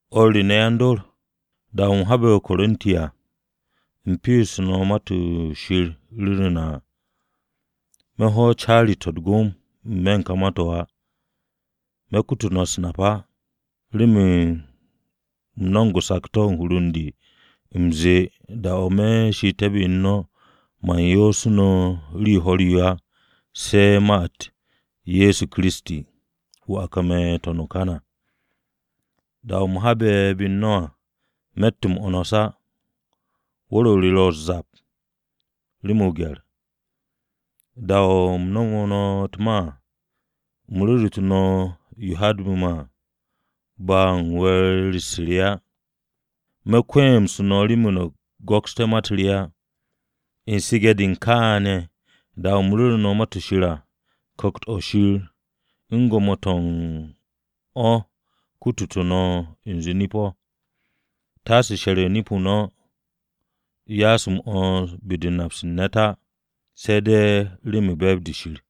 O̱r re ne̱ yan-dor, da-o̱ u̱m habe̱ o-Korinti à, u̱m pe'esu̱te̱ Ma-to̱ Shir ru̱ru̱ na à. Me̱ hwo̱ caari-to̱ u̱t-gom n-me̱ u̱n ka ma-to̱ á, me̱ kutu no̱ u̱s-nap á. Remen u̱m no̱mo̱g o-sakto̱ u̱n hur u̱n de, u̱m ze̱e̱ da-o̱ me̱ she'ete̱ u̱n no̱ ne̱ man yoosu̱ no̱ rii ho̱r-yo á se̱ ma-u̱t Ye̱so Kiristi, wu̱ a kame̱ n-to̱n o-kan à. Da-o̱ u̱m habe̱ be u̱n no̱ à, me̱tt m-'wo̱ns á. Wu̱r-o re ro u̱s-zap, rem o-gye̱r. Da-o̱ u̱m nomo no̱ u̱t-ma à, u̱m ru̱ru̱tu̱ no̱ yo haadbu̱ me̱ à, ba u̱n we̱e̱r-u̱s re á. Me̱ kwe̱e̱msu̱ no̱ remen no̱ go̱ksté̱ ma-u̱t re á. U̱n su̱ge̱-de u̱n kaane̱ da-o̱ u̱m ru̱ru̱ no̱ Ma-to̱ Shir à, Ku̱kt-o̱ Shir u̱n gwo̱mo-to̱ u̱n o̱ kututu̱ no̱ u̱nze nip-o̱, taase she̱r u̱n nip-o no̱ ya'as m-'wo̱ns be-de u̱n nap-se u̱n ne̱t á, se̱ de̱ remen u̱n be̱e̱b-de Shir.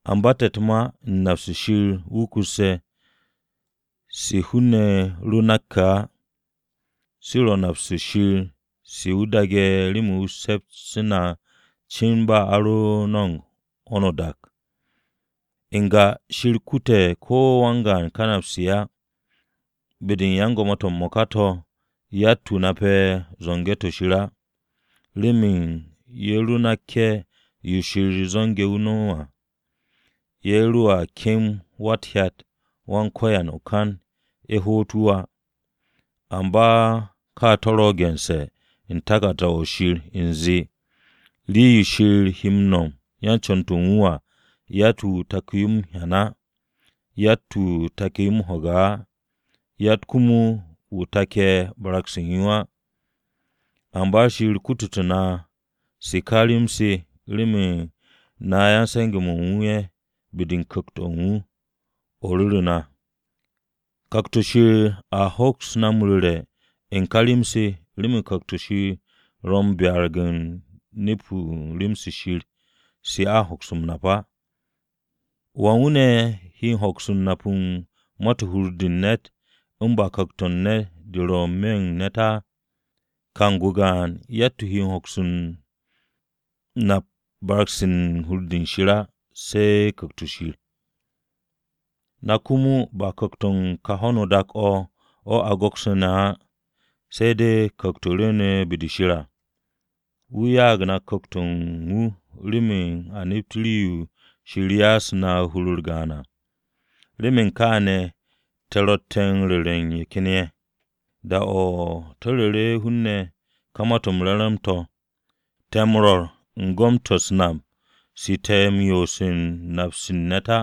Amba te̱ u̱t-ma u̱n nap-se Shir wukusse̱, se hun-ne̱ ro nakke̱ á, se ro̱ nap-se Shir se wu̱ daage̱ remen se̱ps-m na cin ba a ro̱ no̱mo̱g ho̱no o-dak à. N-ga Shir kute̱ ko̱ wan-gaan ka napse̱ á. Be-de u̱n yan-gwo̱mo-to̱ m-mo̱ka to̱ yatt-wu̱ nape̱ zo̱nge̱-to̱ Shir á, remen ye̱ ro nakke̱ yo Shir zo̱nge̱ m-nom à ye̱ roa kem Wa-u̱t-Hyat Wan-Ko̱yan o-kan ye̱ hoot wu̱ á. Amba ka to̱ ro̱ gense̱ u̱n taku̱rda-o̱ Shir u̱nze: “Rii-yo Shir he nome̱ yan-co̱n-to̱ u̱n wu̱ à yatt-wu̱ taku̱ yo m-hyan á, yatt-wu̱ take̱ m-ho̱ge̱ á, yatt komo wu̱ take̱ barag-se u̱n yo á.” Amba Shir kututu̱ na se ká rem-se remen na yan-se̱nge̱-mo̱ u̱n wu̱ ye̱ be-de u̱n Ku̱kt-o̱ u̱n wu̱ o̱ ru̱ru̱ na. Ku̱kt-o̱ Shir a hoks na ru̱re̱ u̱n ka rem-se remen Ku̱kt-o̱ ro̱ m-byarag o̱ nep rem-se Shir se a hoks m-nap á. ¿Wan wu̱ ne̱ he hoks m-nap u̱n ma-to̱ u̱n hur-de u̱n ne̱t u̱n ba ku̱kt-o u̱n ne̱t o̱ ro̱ n-me̱ u̱n ne̱t á? Kang-o gaan yatt-wu̱ nape̱ barag-se ro̱ u̱n hur-de Shir á, se̱ Ku̱kt-o̱ Shir. Na komo ba ku̱kt-o̱ u̱n kà ho̱no dak-o̱ o̱ a go̱ksu̱ne̱ á, se̱ de̱ Ku̱kt-o̱ rwu̱u̱ne̱ be-de Shir à. Wu̱ ya'ag na Ku̱kt-o̱ u̱n wu̱ remen a nept rii-yo Shir ya'asu̱ na hur-u̱r gaan à. Remen kaane̱ te̱ ro̱tte̱ u̱n ru̱re̱ u̱n ye̱ ken ye̱. Da-o̱ te̱ ru̱re̱ hun-ne̱ ka Ma-to̱ m-Re̱re̱m to̱, te̱ m-rwo̱r u̱n gom-to̱ u̱s-nap se te̱ yoose̱ u̱n nap-se u̱n ne̱t á,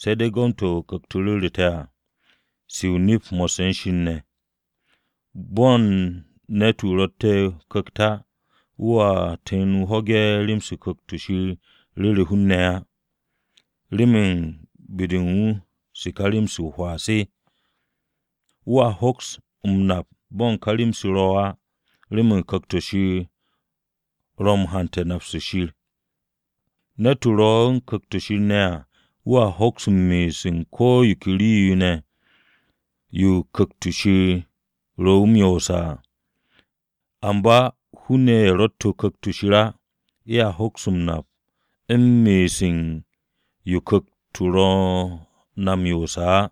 se̱ de̱ u̱n gom-to̱ Ku̱kt-o ru̱ru̱ te̱ à, se o-nip mo̱sse̱ u̱n Shir ne̱. Bo̱n ne̱t-wu̱ ro̱tte̱ o-Ku̱kt á wu̱a tu̱n wu̱ ho̱ge̱ rem-se Ku̱kt-o̱ Shir ru̱re̱ hun-ne̱ á, remen be-de u̱n wu̱ se ka rem-se o-hwaa se. Wu̱a hoks m-nap bo̱ ka rem-se ro̱ á, remen Ku̱kt-o̱ Shir o̱ ro̱ u̱n hante̱ u̱n nap-se Shir. Ne̱t-wu̱ ro̱ u̱n Ku̱kt-o̱ Shir ne̱ à, wu̱a hoks nap u̱n me'es u̱n ko̱ yo ke rii-yo ne̱, yo Ku̱kt-o̱ Shir ro̱ wu̱ m-yoose̱ à. Amba hun-ne̱ ye̱ ro̱tte̱ Ku̱kt-o̱ Shir á ye̱a hoks m-nap u̱n me'es u̱n yo Ku̱kt ro̱ na m-yoose̱ á.